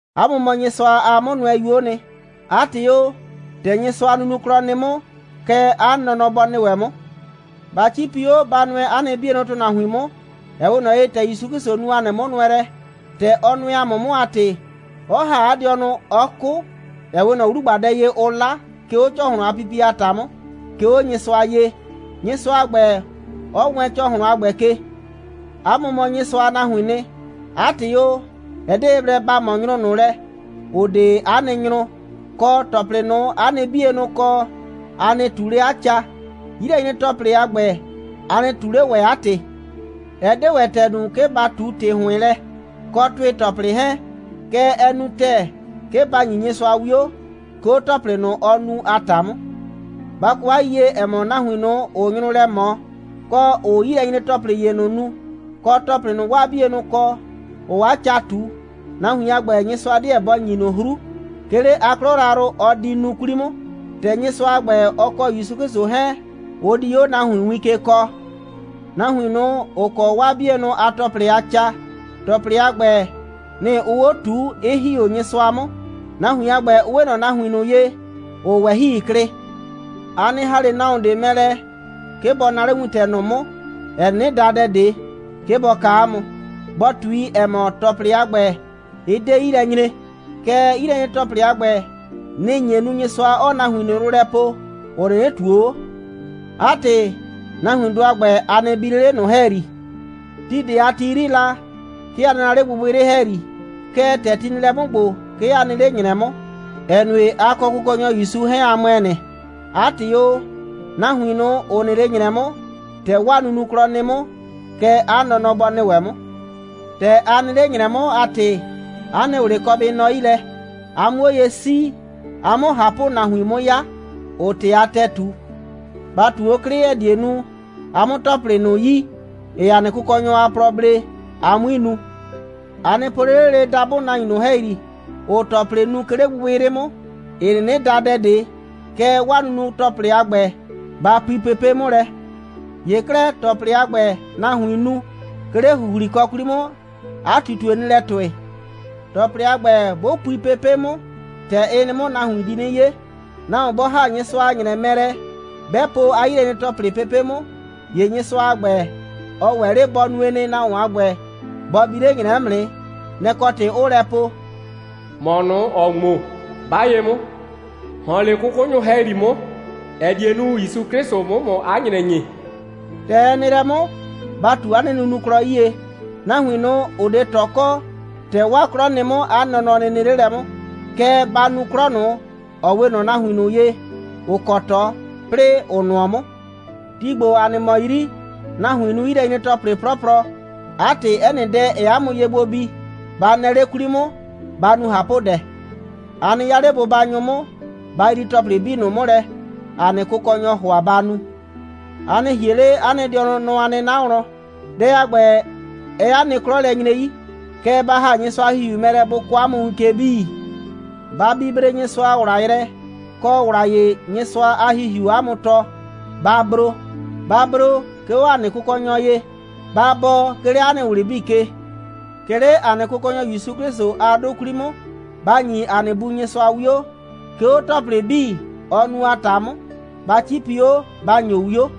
'A mʋ mɔ Nyɩsʋa a 'mʋnʋɛyuo'o nɩ. 'A ‑tɩ o, ‑tɛ Nyɩsʋa a nunuklɔ nɩ 'mʋ, kɛ 'a nɔnɔ bɔ nɩ ‑wɛ 'mʋ. Ba 'cipi 'o, ba nʋɛ 'a nɩ 'bienʋ ‑tʋnahuin 'mʋ, ‑ɛ 'we ꞊nɔ ye, ‑tɛ ‑Yusu 'Klɩsʋ nu ‑a nɩ 'mʋnʋɛlɛ. ‑Tɛ ɔ nʋɛ ‑a mʋ 'mʋ a ‑tɩ, 'ɔ ‑ha 'a dɩɔnʋ, 'ɔ 'kʋ, ‑ɛ 'we ꞊nɔ 'wlugbadɛ ye, ʋʋ 'la, 'ke 'o ‑cɔhlʋn a pipie a ‑ta 'mʋ, 'ke 'o Nyɩsʋa ye, Nyɩsʋa a ‑gbɛ 'ɔ wɛɛn ‑cɔhlʋn a ‑gbɛ ke. 'A mʋ mɔ Nyɩsʋa a nahuiin nɩ. 'A ‑tɩ o, ɛ 'de ye blɛ ba ꞊mɔ nyrʋ ꞊nʋ lɛ, ‑ʋ 'de 'a nɩ nyrʋ, kɔ, ‑tɔplɩ ꞊nʋ, 'a nɩ 'bienʋ kɔ, a nɩ ꞊tu 'le 'a ca. 'Yilɛnyre‑tɔplɩ a ‑gbɛ, a nɩ ꞊tu 'le ‑wɛ 'a ‑tɩ. Ɛ 'de ‑wɛ ‑tɛɛ nu, 'ke ba ꞊tu ‑tɩ ‑hʋɩn lɛ, kɔ ‑tʋɩ‑tɔplɩ 'hɛɛn. Kɛɛ, ɛ nu ‑tɛɛ, 'ke ba ‑nyi Nyɩsʋa 'wio, 'ke 'o ‑tɔplɩ ꞊nʋ, ɔɔ nu a ‑ta 'mʋ. Ba kɔ 'a yiyie, ‑ɛ mɔ, nahuin ꞊nʋ, ‑ʋʋ nyrʋ lɛ ꞊mɔ, kɔ, ‑ʋʋ 'yilɛnyre‑tɔplɩ ‑ye ꞊nʋ nu, kɔ, ‑tɔplɩ ꞊nʋ, 'waa 'bienʋ kɔ, ‑ʋʋ 'a ca ꞊tu, nahuin a ‑gbɛ, Nyɩsʋa 'deɛ bɔ ‑nyi ꞊nʋ 'hru, 'ke 'le 'a 'klɔ yrayrʋ, ɔ di nu 'kwli 'mʋ, ‑tɛ Nyɩsʋa a ‑gbɛ, ɔ kɔ ‑Yusu 'Klɩsʋ 'hɛɛn, ʋ di 'o nahuin win ke kɔɔ. Nahuin ꞊nʋ, ‑ʋ kɔ 'waa 'bienʋ a ‑tɔplɩ a ca, ‑tɔplɩ a ‑gbɛ, nɩ‑ ʋʋ 'o ꞊tuu, 'ɩ ‑hi 'o Nyɩsʋa 'mʋ. Nahuin a ‑gbɛ, ʋ 'we ꞊nɔ nahuin ꞊nʋ ye, ‑ʋʋ ꞊wɛhɩi klɩ. A nɩ ‑ha 'le nahuon ꞊de mɛ lɛ, 'ke bɔ naa 'le wintɛ ꞊nʋ 'mʋ, ‑ɛ 'nɩnɩ da dɛ ꞊de, 'ke bɔ kaa 'a mʋ, bɔ ꞊tui, ‑ɛ mɔ, ‑tɔplɩ a ‑gbɛ, ɩ 'de 'yi lɛ nyre. Kɛɛ, 'yilɛnyre‑tɔplɩ a ‑gbɛ, nɩ‑ nye nu, Nyɩsʋa 'ɔɔ nahuin ꞊nʋ yrʋ lɛ poo, ‑ʋ 'nɩnɩ ꞊tuo 'o. 'A ‑tɩ, nahuindʋ a ‑gbɛ, a nɩ bi 'le 'le ꞊nʋ ‑hɛyri. Ti ꞊de a ti 'yri la, 'ke a nɩ la 'le gbɩgbɩyrɩ ‑hɛyri, kɛɛ, ‑tɛ ti nɩ lɛ 'mʋ ‑gbo, 'ke a nɩ 'le ‑nyrɛ 'mʋ, ‑ɛ nue, a kɔ Kʋkɔnyɔ ‑Yusu 'hɛɛn, a ‑mʋɛ nɩ. 'A ‑tɩ o, nahuin ꞊nʋ, ‑ʋ nɩ 'le ‑nyrɛ 'mʋ, ‑tɛ 'waa nunuklɔ nɩ 'mʋ, kɛ 'a nɔnɔ bɔ nɩ ‑wɛ 'mʋ. ‑Tɛ a nɩ 'le ‑nyrɛ 'mʋ, 'a ‑tɩ, 'a nɩ ꞊wlɩ kɔ bɩ nɔ 'yi lɛ, a 'mʋ 'o ye 'sii, a 'mʋ ꞊hapʋnahuin 'mʋ 'ya, ‑ʋʋ ‑tɩ a ‑tɛɛ ꞊tu. Ba ꞊tu 'o 'klɩ, ‑ɛ die nu, a 'mʋ ‑tɔplɩ ꞊nʋ yi, ‑ɩɩ ‑a nɩ Kʋkɔnyɔ a plɔ blee, a 'mui nu. A nɩ po 'le 'le dabʋ nahuin ꞊nʋ ‑hɛyri, ‑ʋʋ ‑tɔplɩ nu, 'ke 'le gbɩgbɩyrɩ 'mʋ, ‑ɩ 'nɩnɩ da dɛ ꞊de, kɛɛ, 'waa nunu‑tɔplɩ a ‑gbɛ, ba pui pepe' 'mʋ lɛ. ‑Ye 'klɛɛ, ‑tɔplɩ a ‑gbɛ, nahuiin nu, 'ke 'le ‑huhlikɔ 'kwli 'mʋ, 'a ꞊tutue nɩ lɛ ‑tʋɩ. ‑Tɔplɩ a ‑gbɛ, 'bʋ pui pepe' 'mʋ, ‑tɛ ɩ nɩ 'mʋ, nahuin di 'nɩ 'ye. Nahuon 'bɔ ‑ha Nyɩsʋa a ‑nyrɛ mɛ lɛ, 'bɛ po 'a 'yilɛnyre‑tɔplɩ pepe' 'mʋ, ‑ye Nyɩsʋa a ‑gbɛ, ɔ ‑wɛ 'le bɔ nue nɩ, nahuon a ‑gbɛ, bɔ bi 'le 'a ‑nyrɛ 'mʋ nɩ. Nɛ‑ kɔ ‑tɩ, 'ʋʋ lɛ po: «‑Mɔ ꞊nʋ, ‑ɔɔ ŋmo, 'ba ye 'mʋ, ‑hɔn 'le 'kʋkʋnyʋ ‑hɛyri 'mʋ, ‑ɛ die nu, ‑Yusu 'Klɩsʋ 'mʋ ‑mʋ 'a ‑nyrɛ ‑nyi.» ‑Tɛ ɛ nɩ lɛ 'mʋ, ba ꞊tu 'a nɩ nunuklɔ 'yie. Nahuin ꞊nʋ, ‑ʋ 'de ꞊tɔ kɔ, ‑tɛ 'waa 'klɔ nɩ 'mʋ, 'a nɔnɔ nɩ nɩ 'le lɛ 'mʋ, kɛɛ, ba nu 'klɔ ꞊nʋ, ‑ɔ 'we ꞊nɔ nahuin ꞊nʋ ye, ‑ʋ kɔ ꞊tɔ, 'plɩɩ ‑ʋ nʋɔ 'mʋ. Ti ‑gbo, ‑a nɩ mɔ 'yri, nahuiin nu 'yilɛnyre‑tɔplɩ 'plɔplɔ. 'A ‑tɩ, 'ɛ nɩ dɛ, ‑ɛɛ 'a mʋ ye gbo bi, ba nɛɛ 'le 'kwli 'mʋ, ba nu ꞊hapʋdɛ. A nɩ 'ya 'le bʋbanyʋ 'mʋ, ba yrii ‑tɔplɩ 'bii ꞊nʋ 'mʋ lɛ, ‑a nɩ Kʋkɔnyɔɔ ‑hʋa ba nu. A nɩ ‑hie 'le 'a nɩ dɩɔnʋ nɔ a 'nɩna wlɔn. Dɛ a ‑gbɛ, ɛɛ 'a nɩ 'klɔ lɛ nyre 'yi. Kɛɛ, ba ‑ha Nyɩsʋa a ‑Hihiu mɛ lɛ, bʋ kɔɔ 'a mʋ win ke 'bii. Ba bibre Nyɩsʋa a ‑wla yrɛ, kɔ ‑wla ‑ye, Nyɩsʋa a ‑Hihiuu 'a mʋ tɔɔ, ba bro. Ba bro, 'ke 'o ‑a nɩ Kʋkɔnyɔ ye. Ba bɔɔ, 'ke 'le 'a nɩ ꞊wlɩ 'bii ke. 'Ke 'le ‑a nɩ Kʋkɔnyɔ ‑Yusu 'Klɩsʋ a 'dʋ 'kwli 'mʋ, ba ‑nyi ‑a nɩ Bu Nyɩsʋa 'wio, 'ke 'o ‑tɔplɩ 'bii, ɔɔ nu a ‑ta 'mʋ. Ba 'cipi 'o, ba ‑nyo 'wio.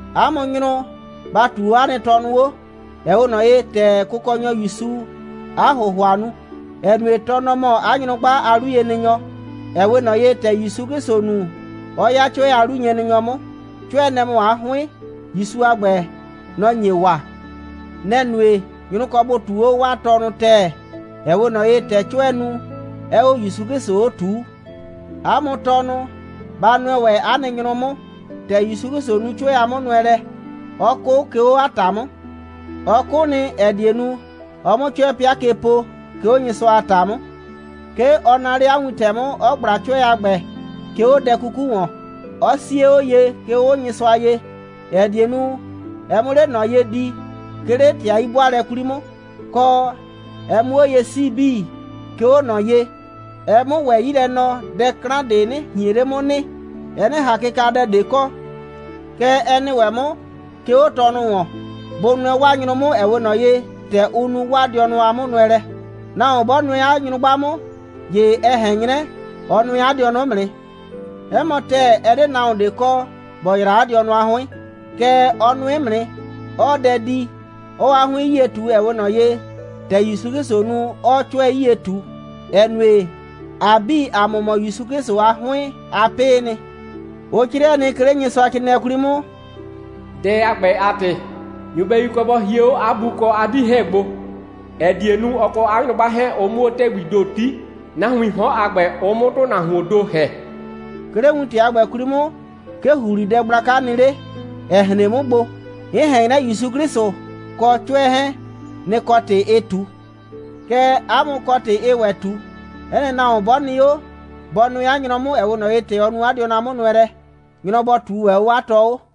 'A mʋ nyrʋ, ba ꞊tuu 'o 'a nɩ tɔnʋ 'o, ‑ɛ 'we ꞊nɔ ye, ‑tɛ Kʋkɔnyɔ ‑Yusuu 'a ‑hʋhʋa nu, ‑ɛ nue, tɔ, nɔ‑ mɔ 'a nyrʋgba a 'luyenɩnyɔ, ‑ɛ 'we ꞊nɔ ye, ‑tɛ ‑Yusu 'Klɩsʋ nu, 'ɔ 'ya 'cʋɛ a 'luyenɩnyɔ 'mʋ. 'Cʋɛ, nɛ‑ mɔ 'a 'hʋɩn. ‑Yusu a ‑gbɛ, nɔ‑ nye waa. Nɛ‑ nue, nyrʋ kɔ bʋ ꞊tuu 'o 'waa tɔnʋ ‑tɛɛ, ‑ɛ 'we ꞊nɔ ye, ‑tɛ 'cʋɛɛ nu, 'ɛɛ 'o ‑Yusu 'Klɩsʋ 'o ꞊tuu. 'A mʋ tɔnʋ, ba nʋɛ ‑wɛ 'a nɩ nyrʋ 'mʋ, ‑tɛ ‑Yusu 'Klɩsʋ nu 'cʋɛ a 'mʋnʋɛlɛ, 'ɔ 'kʋ, 'ke 'o 'a ‑ta 'mʋ. Ɔ 'kʋ nɩ, ‑ɛ die nu, ɔ 'mʋ 'cʋɛ 'pɩa ke po, 'ke 'o Nyɩsʋa a ‑ta 'mʋ. 'Ke ɔ naa 'le 'a wintɛ 'mʋ, 'ɔ ꞊gbla 'cʋɛ a ‑gbɛ, 'ke 'o 'a dɛ 'kuku ‑wɔn, 'ɔ 'sie 'o ye, 'ke 'o Nyɩsʋa ye, ‑ɛ die nu, ɛ 'mʋ 'le ꞊nɔ ye di, 'ke 'le ‑tɩ a 'yi'bʋaalɛ 'kwli 'mʋ, kɔ, ɛ 'mʋ 'o ye 'sii 'bii, 'ke 'o ꞊nɔ ye, ɛ 'mʋ ‑wɛ 'yi lɛ nɔ, dɛ 'klan ꞊de 'nɩ ꞊hien 'le 'mʋ nɩ, ɛ 'nɩ ꞊han kɩkadɛ ꞊de kɔ. Kɛ ɛ nɩ ‑wɛ 'mʋ, 'ke 'o tɔnʋ ‑wɔn. Bʋ nʋɛ 'waa nyrʋ 'mʋ, ‑ɛ 'we ꞊nɔ ye, ‑tɛ ʋ nu 'waa dɩɔnʋ a 'mʋnʋɛlɛ. Nahuon 'bɔ nʋɛ 'a nyrʋgba 'mʋ, ‑ye ɛ ꞊hɛn 'nyrɛ, ɔ nʋɛ 'a dɩɔnʋ 'mʋ nɩ. 'Ɛ mɔ ‑tɛɛ, ɛ 'de nahuon ꞊de kɔ, ‑bɔ yraa 'a dɩɔnʋ a 'hʋɩn. Kɛɛ, ɔ nʋɩ 'mʋ nɩ, 'ɔɔ dɛ di, 'ɔɔ 'a 'hʋɩn 'yie ꞊tu, ‑ɛ 'we ꞊nɔ ye, ‑tɛ ‑Yusu 'Klɩsʋʋ nu, 'ɔɔ 'cʋɛ 'yie ꞊tu, ‑ɛ nue, ‑a 'bii, ‑a mʋ mɔ ‑Yusu 'Klɩsʋ a 'hʋɩn a 'pɩɩ nɩ. Ʋ 'crɩɛ nɩ, 'ke 'le Nyɩsʋacrɩɩnɩɛ 'kwli 'mʋ: «Dɛ a ‑gbɛ a ‑tɩ, nyɩbɛyu kɔ bɔ hie 'o 'a bu kɔ 'a 'dii 'hɛɛn gbo, ‑ɛ die nu, ɔ kɔ 'a nyrʋgba 'hɛɛn, ʋ 'mʋ 'o ‑tɛgbii ‑do 'ti, nahuiin 'hɔn a ‑gbɛ, ʋ 'mʋ ‑tʋnahuoon ‑do ‑hɛ.» 'Ke 'le wintɛ a ‑gbɛ 'kwli 'mʋ, 'ke ‑huhlidɛ gblaka nɩ 'le, 'ɛ hren 'mʋ gbo. 'N ꞊hɛn 'nyrɛ, ‑Yusu 'Klɩsʋ kɔ 'cʋɛ 'hɛɛn, nɩ‑ kɔ ‑tɩ ɩɩ ꞊tu. Kɛɛ, 'a mʋ kɔ ‑tɩ ɩɩ ‑wɛ ꞊tu: 'Ɛ nɩ nahuon 'bɔ nɩ 'o, bɔ nʋɛ 'a nyrɔ 'mʋ, ‑ɛ 'we ꞊nɔ ye, ‑tɛ ɔ nu 'a dɩɔnʋ a 'mʋnʋɛlɛ. Nyrɔ bɔ ꞊tuu ‑wɛ 'o 'a tɔ 'o.